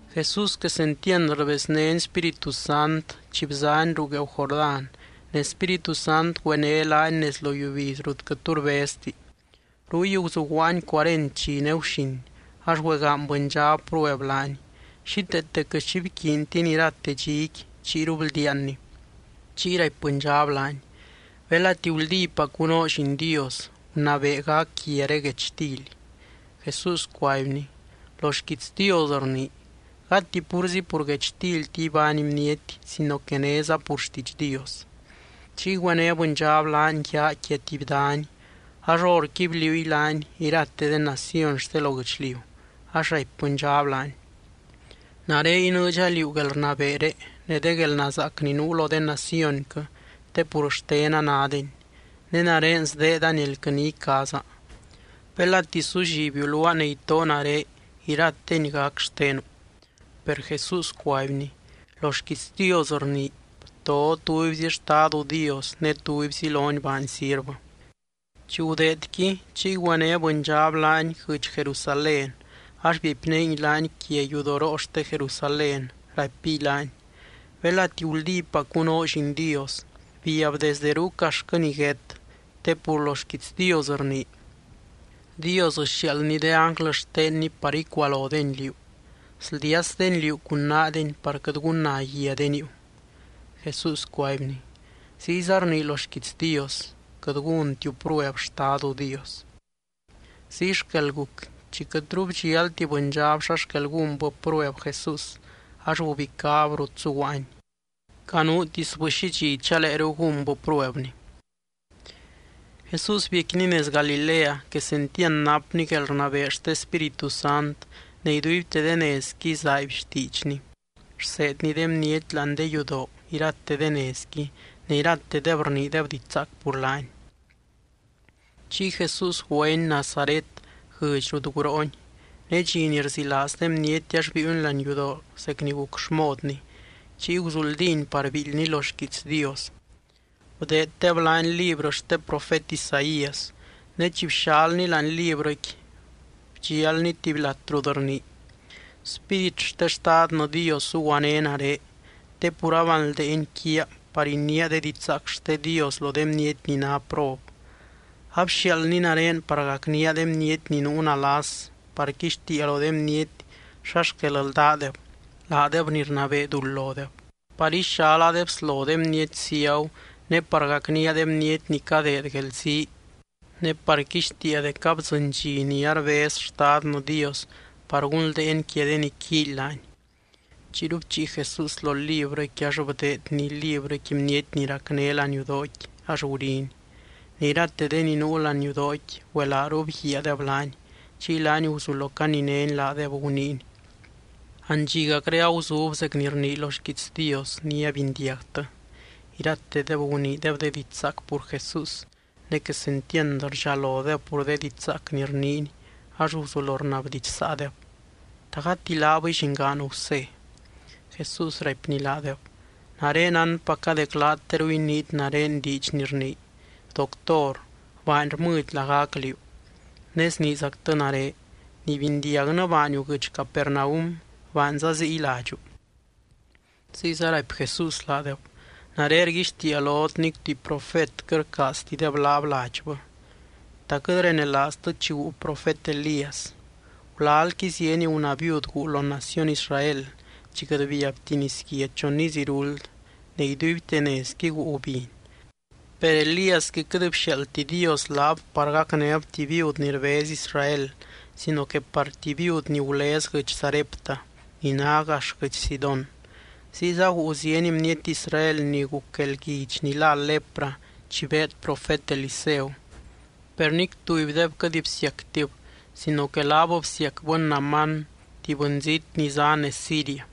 Jesús quesentiand rbeznény Spíritu Sant chi bzany ruu gueeu Jordán, ne Spíritu Sant güené laany nez lo yiubiz rut quɨt tu rbezti. Ruy guzuguaany cuarent dxi ne guxin ax güegaany bɨndxab prueb laany. Xíteete quɨt xi bquiintiny irate dxiqui, chiyru bldiaanny. Chiy raipy bɨndxab laany: —Belati guldípacu noo Lliin Dios, gunabee gac guiaré guechtily. Jesús cuaibny: —Lo xquiits Dios rnii: “Gati púrzi pur guechtilti ibány bniety sino que néza pur xtiidx Dios.” Chiy güené bɨndxab laany yaa quia tuby dany ax horqui bliuungui laany irate de naciony xte lo guɨchliu ax raipy bɨndxab laany: —Nare inɨɨdxa liú guelrnabeeré ne de guelnazaac ni nuu lo de nacionquɨ te pur xtena nádeni. Ne nare sdeedani elquɨ ni icaaza. Belati sullibiu luaa ne itoo nare, irateni gac xtenu. Per Jesús cuaibny: —Lo xquiits Dios rnii: “Bto tubyzi Xtadu Dios ne tubyzi lony baany sirvɨ.” Chi gudeedqui, chiy güené bɨndxab laany guɨdx Jerusalén ax biepnéngui laany quia yudoroo xte Jerusalén, raipiy laany: —Belati guldípacu noo Lliin Dios, biab desde ruuc axtquɨ niguét te pur lo xquiits Dios rnii: Dios sxiaaldny de ánglɨ xtenny par icualodeny liú. Sldiasdeny liú cun naadeny par quɨt gunna guia de niiu. Jesús cuaibny: —Ziyza rnii lo xquiits Dios: “Quɨt gúntiu prueb Xtadu Dios.” Ziy xquel guc, chi quɨtru bdxialti bɨndxab xa xquel gúnbɨ prueb Jesús, ax gubicáb rut zuguaany. Canuutisbɨ xi dxi chaleeru gúnbɨ pruebny. Jesús biecquiny nez Galilea quesentiand napny guelrnabee xte Spíritu Sant ne iduibte de nezqui zaaiby xtiidxny. Rseedny de bniety láani de yudoo irate de nezqui, ne iratedeb rniideb diidx zaac pur laany. Chiy Jesús güeny Nazaret guɨdx rut guroony. Ne dxi ni rzilaaz de bniety ax biiuny láani yudoo zec ni guc xmodny, chiy guzuldíny par biildyny lo xquiits Dios. Bdeeddeb laany librɨ xte profet Isaías. Ne chi bxalny láani librɨqui, bdxialny tuby lat rut rnii: Spírit xte Xtadnɨ Dios zuguané nare te pur abanldeeny quiaa par iniia de didxzaac xte Dios lo de bniety ni ná prob. Abxiaaldny nare par gacnía de bniety ni nuu nalas, par quixtiia lo de bniety xa xquel ldádeb, laadeb ni rnabee duld lodeb, par ixala de bslo de bniety ciagu ne par gacnía de bniety ni cadeed guelzii. Ne par quixtiia dec abdzɨny dxi ni arbez Xtadnɨ Dios par gunldeeny quia de ni quíily laany. Chiyru bchii Jesús lo librɨqui ax bdeedny librɨqui bniety ni racné láani yudooqui ax guriny. Ne irate de ni nuu láani yudooqui güelaaru bguiaadeb laany, chiy laany guzulo caninény laadeb, guniiny: —Andxigacré aguzub zec ni rnii lo xquiits Dios ni abindiagtɨ. Iratedeb guniideb de diidx zaac pur Jesús, ne quesentiand rdxalodeb pur de diidx zaac ni rniiny ax guzulo rnabdidxsaadeb: —¿Ta gati laabɨy llingaan Gusé? Jesús raipny laadeb: —Nare nánpaca dec laat teru iniit nare diidx ni rnii: “Doctor, baany rmɨdy lagac liú”, ne sniizactɨ nare: “Ni bindiagnɨ baaniu guɨdx Capernaum, baanza ziy ladxu.” Ziyza raipy Jesús laadeb: —Nare rguixtiia lot nic tuby profet quɨt rcaaztideb laab ladxbɨ. ¿Ta quɨt renelaaztɨ chi guu profet Elías? Gulalqui zieny gunaa viud guu lo naciony Israel chi quɨt biabti nisguia chon iz iruld ne iduibte nezqui guu gubiny. Per Elíasqui quɨt bxiaaldti Dios laab par gacnéb tuby viud ni rbez Israel sino que par tuby viud ni gulez guɨdx Sarepta, ni ná gax guɨdx Sidón. Ziyza guu zieny bniety Israel ni guc guelguidx ni lá lepra chi beed profet Eliseu, per nic tubydeb quɨt bsiactib sino que laab bsiacbɨ Naamán tuby bɨnzít ni zá nez Siria.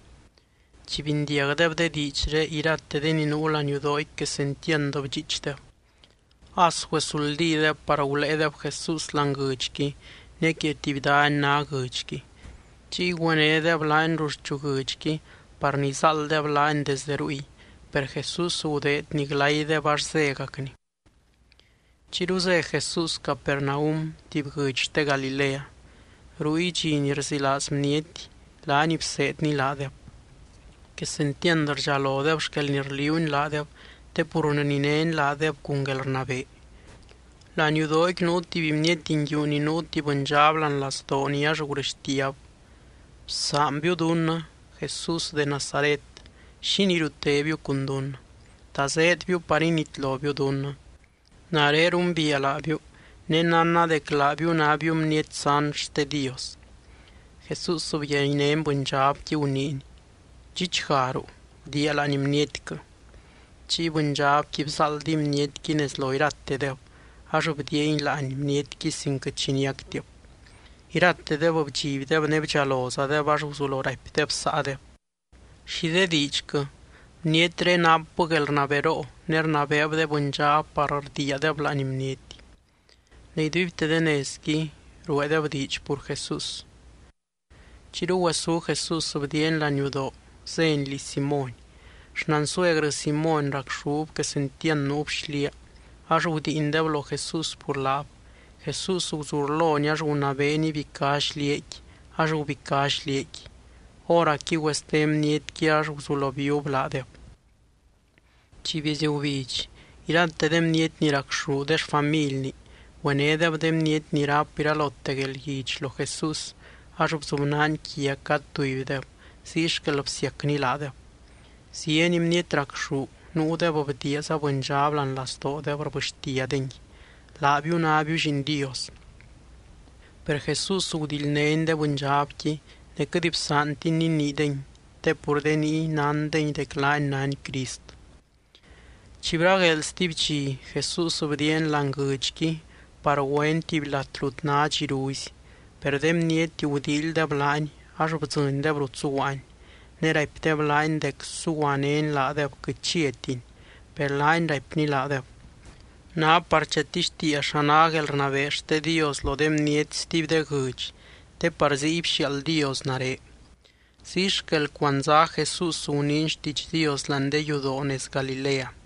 Chi bindiagdeb de diidxré, irate de ni nuu láani yudoo quesentiand bdxiichdeb. As güesuldídeb par guléedeb Jesús láani guɨdxqui ne quia tuby dany ná guɨdxqui. Chiy güenédeb laany ruxchu guɨdxqui par nizáalddeb laany desdɨ ruy. Per Jesús gudeedny glaydeb ax zégacny. Chiyru zé Jesús Capernaum tuby guɨdx xte Galilea. Ruy, dxi ni rzilaaz bniety, laany bseedny laadeb. Quesentiand rdxalodeb xquel ni rliuuny laadeb te pur rninény laadeb cun guelrnabee. Láani yudooqui nuu tuby bniety nguiu ni nuu tuby bɨndxab láani lazdooni ax gurɨxtiab: —Bsaanbiu dunnɨ, Jesús de Nazaret. ¿Xínii riutébiu cun dunnɨ? ¿Ta zéedbiu par initlobiu dunnɨ? Nare rumbiia laabiu, ne nánna dec laabiu nábiu Bniety sant xte Dios. Jesús byaynény bɨndxabqui guniiny: —¡Dxichgaruu, bdiia láani bnietquɨ! Chiy bɨndxabqui bzáaldiy bnietqui nez lo iratedeb ax bdiiangui láani bnietqui sin quɨt xi niactib. Iratedeb bdxibdeb ne bdxalozadeb ax guzulo raipdeb saadeb: —¿Xi de diidxquɨ? ¡Bnietré napbɨ guelrnaberoo ne rnabeeb de bɨndxab par rdiiadeb láani bniety! Ne iduibte de nezqui rueedeb diidx pur Jesús. Chiyru güesú Jesús bdiiany laniudoo zény liz Simóny. Xnansuegrɨ Simóny racxúb quesentiand nuub xliaa, ax gudiindeb lo Jesús pur laab. Jesús guzurlony ax gunabeeny ibicá xliaaqui ax gubicá xliaaqui. Hóracqui güeste bnietqui ax guzulo bíub laadeb. Chi bieezy gubidx, irate de bniety ni racxú de xfamilni, güenédeb de bniety ni ráp iralote guelguidx lo Jesús ax bzubnaany quia cad tubydeb ziy xquel bsiacny laadeb. Zieny bniety racxú, nuudeb bdiiaza bɨndxab láani lazdoodeb rbɨxtiadengui: —Laabiu nábiu Lliin Dios. Per Jesús gudildnény de bɨndxabqui ne quɨt bsaantiny niniidengui te pur de niy nándengui dec laany nány Crist. Chi bragueel stuby dxi, Jesús bdiiany láani guɨdxqui par güeny tuby lat rut ná dxiruzi. Per de bniety gudíilydeb laany ax bdzɨndeb rut zuguaany. Ne raipdeb laany dec suguanény laadeb quɨt chiatiny. Per laany raipny laadeb: —Ná par chatixtiia xa ná guelrnabee xte Dios lo de bniety stuby de guɨdx te par ziy bxiaald Dios nare. Ziy xquel cuandzá Jesús guniiny xtiidx Dios láani de yudoo nez Galilea.